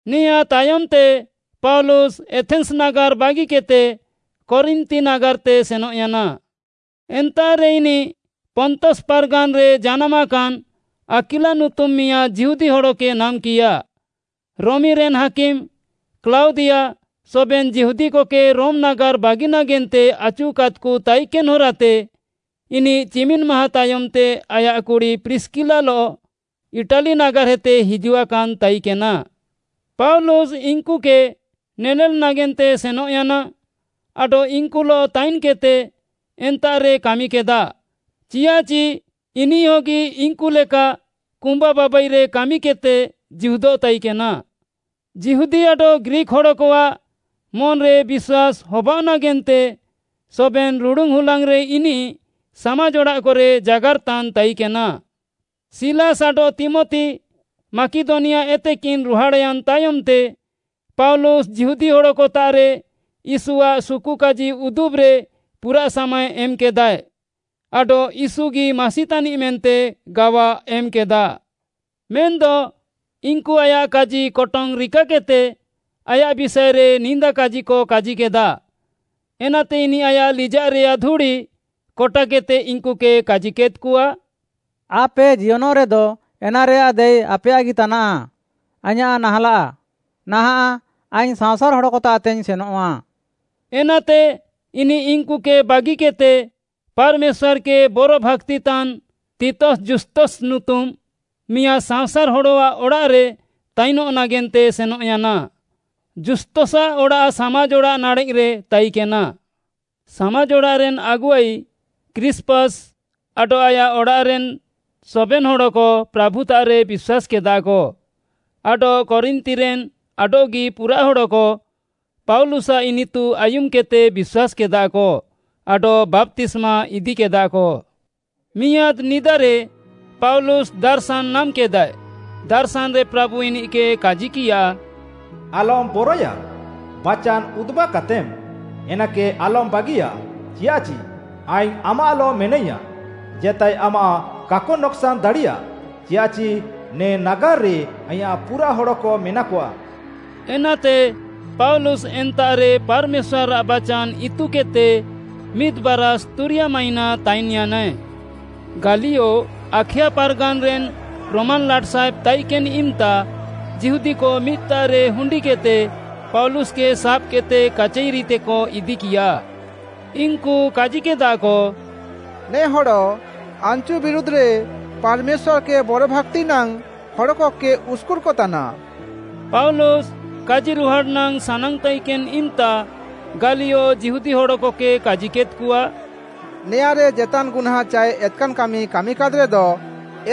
ନେଆଁଁ ତାୟମ୍‌ତେ ପାଉଲୁସ୍‌ ଏଥେନ୍‌ସ୍‌ ନାଗାର୍‌ ବାଗିକେଦ୍‌ତେ କରିନ୍ଥି ନାଗାର୍‌ତେ ସେନଃୟାନା। ଏନ୍ତାଃରେ ଇନିଃ ପନ୍ତସ୍‌ ପାର୍‌ଗାନ୍‌ରେ ଜାନାମାକାନ୍‌ ଆକ୍ୱିଲା ନୁତୁମ୍‌ ମିଆଁଦ୍‌ ଯିହୁଦୀ ହଡ଼କେ ନାମ୍‌କିୟା। ରୋମିରେନ୍‌ ହାକିମ୍‌ କ୍ଲାଉଦିଆ ସବେନ୍‌ ଯିହୁଦୀକକେ ରୋମ୍‌ ନାଗାର୍‌ ବାଗି ନାଗେନ୍ତେ ଆଚୁକାଦ୍‌କ ତାଇକେନ୍‌ ହରାତେ ଇନିଃ ଚିମିନ୍‌ ମାହାଁ ତାୟମ୍‌ତେ ଆୟାଃ କୁଡ଼ି ପ୍ରିସ୍‌କିଲାଲଃ ଇଟାଲି ନାଗାର୍‌ହେତେ ହିଜୁଆକାନ୍‌ ତାଇକେନା। ପାଉଲୁସ୍‌ ଇନ୍‌କୁକେ ନେନେଲ୍‌ ନାଗେନ୍ତେ ସେନଃୟାନା, ଆଡଃ ଇନ୍‌କୁଲଃ ତାଇନ୍‌କେଦ୍‌ତେ ଏନ୍ତାଃରେ କାମିକେଦା, ଚିଆଃଚି ଇନିଃହଗି ଇନ୍‌କୁ ଲେକା କୁମ୍ବା ବାବାଇରେ କାମିକେଦ୍‌ତେ ଜୀହୁଦଃ ତାଇକେନା। ଯିହୁଦୀ ଆଡଃ ଗ୍ରୀକ୍‌ ହଡ଼କଆଃ ମନ୍‌ରେ ବିଶ୍ୱାସ୍‌ ହବାଅଃ ନାଗେନ୍ତେ ସବେନ୍‌ ରୁଡ଼ୁନ୍‌ ହୁଲାଙ୍ଗ୍‌ରେ ଇନିଃ ସାମାଜ୍‌ ଅଡ଼ାଃକରେ ଜାଗାର୍‌ତାନ୍‌ ତାଇକେନା। ସିଲାସ୍‌ ଆଡଃ ତୀମଥି ମାକିଦନିଆଏତେକିନ୍‍ ରୁହାଡ଼୍‌ୟାନ୍‌ ତାୟମ୍‌ତେ ପାଉଲୁସ୍‌ ଯିହୁଦୀ ହଡ଼କତାଃରେ ୟୀଶୁଆଃ ସୁକୁକାଜି ଉଦୁବ୍‌ରେ ପୁରା ସାମାଏ ଏମ୍‌କେଦାଏ, ଆଡଃ ୟୀଶୁଗି ମାସି ତାନିଃ ମେନ୍ତେ ଗାୱା ଏମ୍‌କେଦା। ମେନ୍‌ଦ ଇନ୍‌କୁ ଆୟାଃ କାଜିକଟଙ୍ଗ୍‌ ରିକାକେଦ୍‌ତେ ଆୟାଃ ବିଷାଏରେ ନିନ୍ଦାକାଜିକ କାଜିକେଦା। ଏନାତେ ଇନିଃ ଆୟାଃ ଲିଜାଃରେୟାଃ ଧୁଡ଼ି କଟାକେଦ୍‌ତେ ଇନ୍‌କୁକେ କାଜିକେଦ୍‌କଆ, “ଆପେ ଜିୟନଃରେଦ ଏନାରେୟାଃ ଦାୟୀ ଆପେୟାଃଗି ତାନାଃ, ଆଇଁୟାଃ ନାହାଁଲାଃ। ନାହାଁଃ ଆଇଙ୍ଗ୍‌ ସାଅଁସାର୍‌ ହଡ଼କତାଃତେଇଙ୍ଗ୍‌ ସେନଃଆ।” ଏନାତେ ଇନିଃ ଇନ୍‌କୁକେ ବାଗିକେଦ୍‌ତେ ପାର୍‌ମେଶ୍ୱାର୍‌କେ ବରଭାକ୍ତିତାନ୍‌ ତିତସ୍‌ ଜୁସ୍ତସ୍‌ ନୁତୁମ୍‌ ମିଆଁଦ୍‌ ସାଅଁସାର୍‌ ହଡ଼ଆଃ ଅଡ଼ାଃରେ ତାଇନଃ ନାଗେନ୍ତେ ସେନଃୟାନା। ଜୁସ୍ତସ୍‌ଆଃ ଅଡ଼ାଃ ସାମାଜ୍‌ ଅଡ଼ାଃ ନାଡ଼େଃରେ ତାଇକେନା। ସାମାଜ୍‌ଅଡ଼ାଃରେନ୍‌ ଆଗୁଆଇ କ୍ରୀଷ୍ପସ୍‌ ଆଡଃ ଆୟାଃ ଅଡ଼ାଃରେନ୍‌ ସବେନ୍‌ ହଡ଼କ ପ୍ରାଭୁତାଃରେ ବିଶ୍ୱାସ୍‌କେଦାକ ଆଡଃ କରିନ୍ଥିରେନ୍‌ ଆଡଃଗି ପୁରାଃ ହଡ଼କ ପାଉଲୁସ୍‌ଆଃ ଇନିତୁ ଆୟୁମ୍‌କେଦ୍‌ତେ ବିଶ୍ୱାସ୍‌କେଦାକ ଆଡଃ ବାପ୍ତିସ୍ମା ଇଦିକେଦାକ। ମିଆଁଦ୍‌ ନିଦାରେ ପାଉଲୁସ୍‌ ଦାର୍‌ଶାନ୍‌ ନାମ୍‌କେଦାଏ, ଦାର୍‌ଶାନ୍‌ରେ ପ୍ରାଭୁ ଇନିଃକେ କାଜିକିୟା, “ଆଲମ୍‌ ବରଏୟା, ବାଚାନ୍‌ ଉଦୁବ୍‌କାତେମ୍‌, ଏନାକେ ଆଲମ୍‌ ବାଗିୟା, ଚିଆଃଚି ଆଇଙ୍ଗ୍‌ ଆମାଃଲଃ ମେନାଇୟାଁଃ। ଜେତାଏ ଆମାଃ କାକ ନକ୍‌ସାନ୍‌ ଦାଡ଼ିୟା, ଚିଆଃଚି ନେ ନାଗାର୍‌ରେ ଆଇଁୟାଃ ପୁରାଃ ହଡ଼କ ମେନାକଆ।” ଏନାତେ ପାଉଲୁସ୍‌ ଏନ୍ତାଃରେ ପାର୍‌ମେଶ୍ୱାର୍‌ଆଃ ବାଚାନ୍‌ ଇତୁକେଦ୍‌ତେ ମିଦ୍‌ ବାରାଷ୍‌ ତୁରିୟା ମାହିଁନା ତାଇନ୍‌ୟାନାଏ। ଗାଲିୟୋ ଆଖାୟା ପାର୍‌ଗାନ୍‌ରେନ୍‌ ରୋମାନ୍‌ ଲାଟ୍‌ସାହେବ୍‌ ତାଇକେନ୍‌ ଇମ୍‌ତା, ଯିହୁଦୀକ ମିଦ୍‌ତାଃରେ ହୁଣ୍ଡିକେଦ୍‌ତେ ପାଉଲୁସ୍‌କେ ସାବ୍‌କେଦ୍‌ତେ କାଚାଇରିତେକ ଇଦିକିୟା। ଇନ୍‌କୁ କାଜିକେଦାକ, “ନେ ହଡ଼ ଆନ୍‌ଚୁ ବିରୁଧ୍‌ରେ ପାର୍‌ମେଶ୍ୱାର୍‌କେ ବରଭାକ୍ତି ନାଙ୍ଗ୍‌ ହଡ଼କକେ ଉସ୍‌କୁର୍‌କତାନା।” ପାଉଲୁସ୍‌ କାଜିରୁହାଡ଼୍‌ ନାଙ୍ଗ୍‌ ସାନାଙ୍ଗ୍‌ ତାଇକେନ୍‌ ଇମ୍‌ତା, ଗାଲିୟୋ ଯିହୁଦୀ ହଡ଼କକେ କାଜିକେଦ୍‌କଆ, “ନେଆଁରେ ଜେତାନ୍‌ ଗୁହ୍ନାଁ ଚାଏ ଏତ୍‌କାନ୍‌ କାମି କାମିକାଦ୍‌ରେଦ,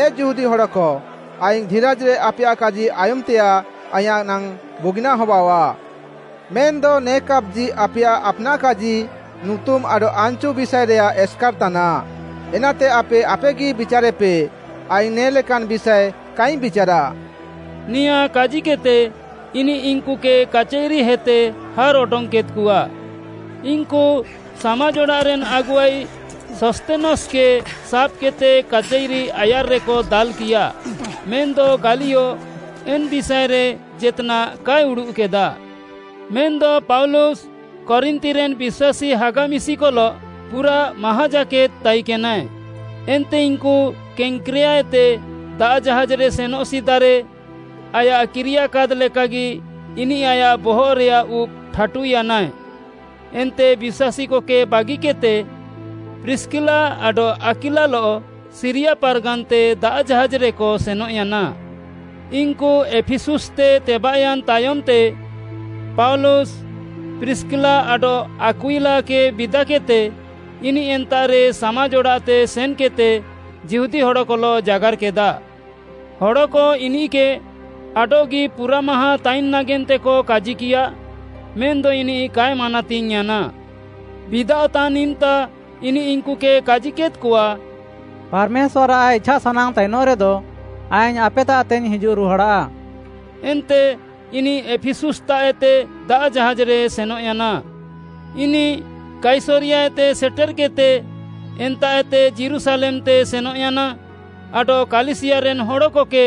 ଏ ଯିହୁଦୀ ହଡ଼କ, ଆଇଙ୍ଗ୍‌ ଧିରାଜ୍‌ରେ ଆପେୟାଃ କାଜି ଆୟୁମ୍‌ତେୟାଃ ଆଇଁୟାଃ ନାଙ୍ଗ୍‌ ବୁଗିନାଃ ହବାଅଃଆ। ମେନ୍‌ଦ ନେ କାପ୍‌ଜି ଆପେୟାଃ ଆପ୍‌ନାଃ କାଜି, ନୁତୁମ୍‌ ଆଡଃ ଆନ୍‌ଚୁ ବିଷାଏରେୟାଃ ଏସ୍‌କାର୍‌ ତାନାଃ, ଏନାତେ ଆପେ ଆପେଗି ବିଚାର୍‌ରେପେ, ଆଇଙ୍ଗ୍‌ ନେ'ଲେକାନ୍‌ ବିଷାଏ କାଇଙ୍ଗ୍‌ ବିଚାରାଃ।” ନେଆଁ କାଜିକେଦ୍‌ତେ ଇନିଃ ଇନ୍‌କୁକେ କାଚାଇରିହେତେ ହାର୍‍ଅଡଙ୍ଗ୍‌କେଦ୍‍କଆ। ଇନ୍‌କୁ ସାମାଜ୍‌ଅଡ଼ାଃରେନ୍‌ ଆଗୁଆଇ ସସ୍ଥେନସ୍‌କେ ସାବ୍‌କେଦ୍‌ତେ କାଚାଇରି ଆୟାର୍‌ରେକ ଦାଲ୍‌କିୟା। ମେନ୍‌ଦ ଗାଲିୟୋ ଏନ୍‌ ବିଷାଏରେ ଜେତ୍‌ନାଃ କାଏ ଉଡ଼ୁଃକେଦା। ମେନ୍‌ଦ ପାଉଲୁସ୍‌ କରିନ୍ଥିରେନ୍‌ ବିଶ୍ୱାସୀ ହାଗା ମିଶିକଲଃ ପୁରାଃ ମାହାଁ ଜାକେଦ୍‌ ତାଇକେନାଏ। ଏନ୍ତେ ଇନ୍‌କୁ କେଙ୍କ୍ରେୟାଏତେ ଦାଆଃ ଜାହାଜ୍‌ରେ ସେନଃ ସିଦାରେ ଆୟାଃ କିରିୟାକାଦ୍‌ ଲେକାଗି ଇନିଃ ଆୟାଃ ବହଃରେୟାଃ ଉବ୍‌ ଠାଟୁୟାନାଏ। ଏନ୍ତେ ବିଶ୍ୱାସୀକକେ ବାଗିକେଦ୍‌ତେ ପ୍ରିସ୍‌କିଲା ଆଡଃ ଆକ୍ୱିଲାଲଃ ସିରିୟା ପାର୍‌ଗାନ୍‌ତେ ଦାଆଃ ଜାହାଜ୍‌ରେକ ସେନଃୟାନା। ଇନ୍‌କୁ ଏଫିସୁସ୍‌ତେ ତେବାଃୟାନ୍‌ ତାୟମ୍‌ତେ ପାଉଲୁସ୍‌, ପ୍ରିସ୍‌କିଲା ଆଡଃ ଆକ୍ୱିଲାକେ ବିଦାକେଦ୍‌ତେ, ଇନିଃ ଏନ୍ତାଃରେ ସାମାଜ୍‌ ଅଡ଼ାଃତେ ସେନ୍‌କେଦ୍‌ତେ ଯିହୁଦୀ ହଡ଼କଲଃ ଜାଗାର୍‌କେଦା। ହଡ଼କ ଇନିଃକେ ଆଡଃଗି ପୁରାଃ ମାହାଁ ତାଇନ୍‌ ନାଗେନ୍ତେକ କାଜିକିୟା, ମେନ୍‌ଦ ଇନିଃ କାଏ ମାନାତିଙ୍ଗ୍‌ୟାନା। ବିଦାଅଃତାନ୍‌ ଇମ୍‌ତା ଇନିଃ ଇନ୍‌କୁକେ କାଜିକେଦ୍‌କଆ, “ପାର୍‌ମେଶ୍ୱାର୍‌ଆଃ ଇଛାସାନାଙ୍ଗ୍‌ ତାଇନଃରେଦ, ଆଇଙ୍ଗ୍‌ ଆପେତାଃତେଇଙ୍ଗ୍‌ ହିଜୁଃ ରୁହାଡ଼ା।” ଏନ୍ତେ ଇନିଃ ଏଫିସୁସ୍‌ତାଃଏତେ ଦାଆଃ ଜାହାଜ୍‌ରେ ସେନଃୟାନା। ଇନିଃ କାଇସରିୟାତେ ସେଟେର୍‌କେଦ୍‌ତେ ଏନ୍ତାଃଏତେ ଯୀରୁଶାଲେମ୍‌ତେ ସେନଃୟାନା ଆଡଃ କାଲିସିୟାରେନ୍‌ ହଡ଼କକେ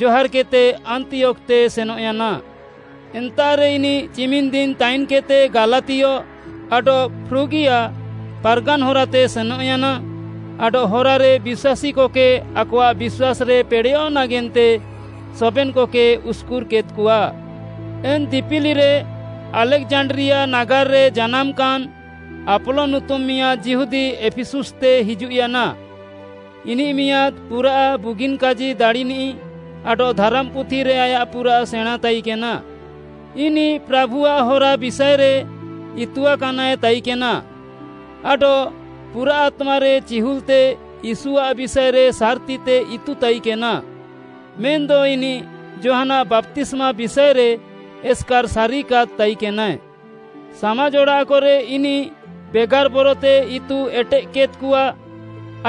ଜହାର୍‌କେଦ୍‌ତେ ଆନ୍ତିୟୋଖ୍‌ତେ ସେନଃୟାନା। ଏନ୍ତାଃରେ ଇନିଃ ଚିମିନ୍‌ଦିନ୍‌ ତାଇନ୍‌କେଦ୍‌ତେ ଗାଲାତିୟ ଆଡଃ ଫ୍ରୁଗିଆଃ ପାର୍‌ଗାନ୍‌ ହରାତେ ସେନଃୟାନା ଆଡଃ ହରାରେ ବିଶ୍ୱାସୀକକେ ଆକଆଃ ବିଶ୍ୱାସ୍‌ରେ ପେଡ଼େୟଃ ନାଗେନ୍ତେ ସବେନ୍‌କକେ ଉସ୍‌କୁର୍‌କେଦ୍‌କଆ। ଏନ୍‌ ଦିପିଲିରେ ଆଲେକ୍‌ଜାଣ୍ଡ୍ରିଆ ନାଗାର୍‌ରେ ଜାନାମାକାନ୍‌ ଆପୋଲୋ ନୁତୁମ୍‌ ମିଆଁଦ୍‌ ଯିହୁଦୀ ଏଫିସୁସ୍‌ତେ ହିଜୁଃୟାନା। ଇନିଃ ମିଆଁଦ୍‌ ପୁରାଃ ବୁଗିନ୍‌ କାଜି ଦାଡ଼ିନିଃ ଆଡଃ ଧାରାମ୍‌ପୁଥିରେ ଆୟାଃ ପୁରାଃ ସେଣାଁତାଇକେନା। ଇନିଃ ପ୍ରାଭୁଆଃ ହରା ବିଷାଏରେ ଇତୁଆକାନାଏ ତାଇକେନା ଆଡଃ ପୁରାଃ ଆତ୍ମାରେ ଚିହୁଲ୍‌ତେ ୟୀଶୁଆଃ ବିଷାଏରେ ସାର୍‌ତିତେ ଇତୁ ତାଇକେନା। ମେନ୍‌ଦ ଇନିଃ ଯୋହାନ୍‌ଆଃ ବାପ୍ତିସ୍ମା ବିଷାଏରେ ଏସ୍‌କାର୍‌ ସାରିକାଦ୍‌ ତାଇକେନାଏ। ସାମାଜ୍‌ ଅଡ଼ାଃକରେ ଇନିଃ ବେଗାର୍‍ ବରତେ ଇତୁ ଏଟେଃକେଦ୍‌କଆ।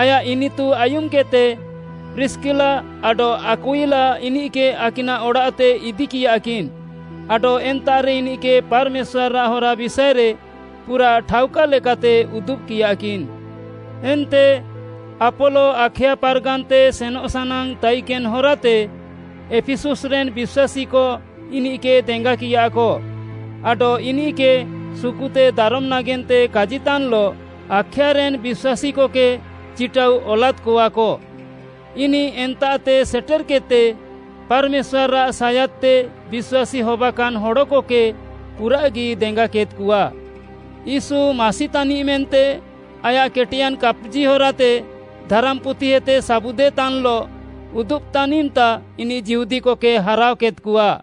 ଆୟାଃ ଇନିତୁ ଆୟୁମ୍‌କେଦ୍‌ତେ ପ୍ରିସ୍‌କିଲା ଆଡଃ ଆକ୍ୱିଲା ଇନିଃକେ ଆକିନାଃ ଅଡ଼ାଃତେ ଇଦିକିୟାକିନ୍‌ ଆଡଃ ଏନ୍ତାଃରେ ଇନିଃକେ ପାର୍‌ମେଶ୍ୱାର୍‌ଆଃ ହରା ବିଷାଏରେ ପୁରାଃ ଠାଉକା ଲେକାତେ ଉଦୁବ୍‌କିୟାକିନ୍‌। ଏନ୍ତେ ଆପୋଲୋ ଆଖାୟା ପାର୍‌ଗାନ୍‌ତେ ସେନଃ ସାନାଙ୍ଗ୍‌ ତାଇକେନ୍‌ ହରାତେ, ଏଫିସୁସ୍‌ରେନ୍‌ ବିଶ୍ୱାସୀକ ଇନିଃକେ ଦେଙ୍ଗାକିୟାକ ଆଡଃ ଇନିଃକେ ସୁକୁତେ ଦାରମ୍‌ ନାଗେନ୍ତେ କାଜିତାନ୍‌ଲଃ ଆଖାୟାରେନ୍‌ ବିଶ୍ୱାସୀକକେ ଚିଟାଉ ଅଲାଦ୍‌କଆକ। ଇନିଃ ଏନ୍ତାଃତେ ସେଟେର୍‌କେଦ୍‌ତେ ପାର୍‌ମେଶ୍ୱାର୍‌ଆଃ ସାୟାଦ୍‌ତେ ବିଶ୍ୱାସୀ ହବାକାନ୍‌ ହଡ଼କକେ ପୁରାଃଗି ଦେଙ୍ଗାକେଦ୍‌କଆ। ୟୀଶୁ ମାସି ତାନିଃ ମେନ୍ତେ, ଆୟାଃ କେଟେୟାନ୍‌ କାପ୍‌ଜି ହରାତେ ଧାରାମ୍‌ପୁଥିଏତେ ସାବୁଦେତାନ୍‌ଲଃ ଉଦୁବ୍‌ତାନ୍‌ ଇମ୍‌ତା ଇନିଃ ଯିହୁଦୀକକେ ହାରାଅକେଦ୍‌କଆ।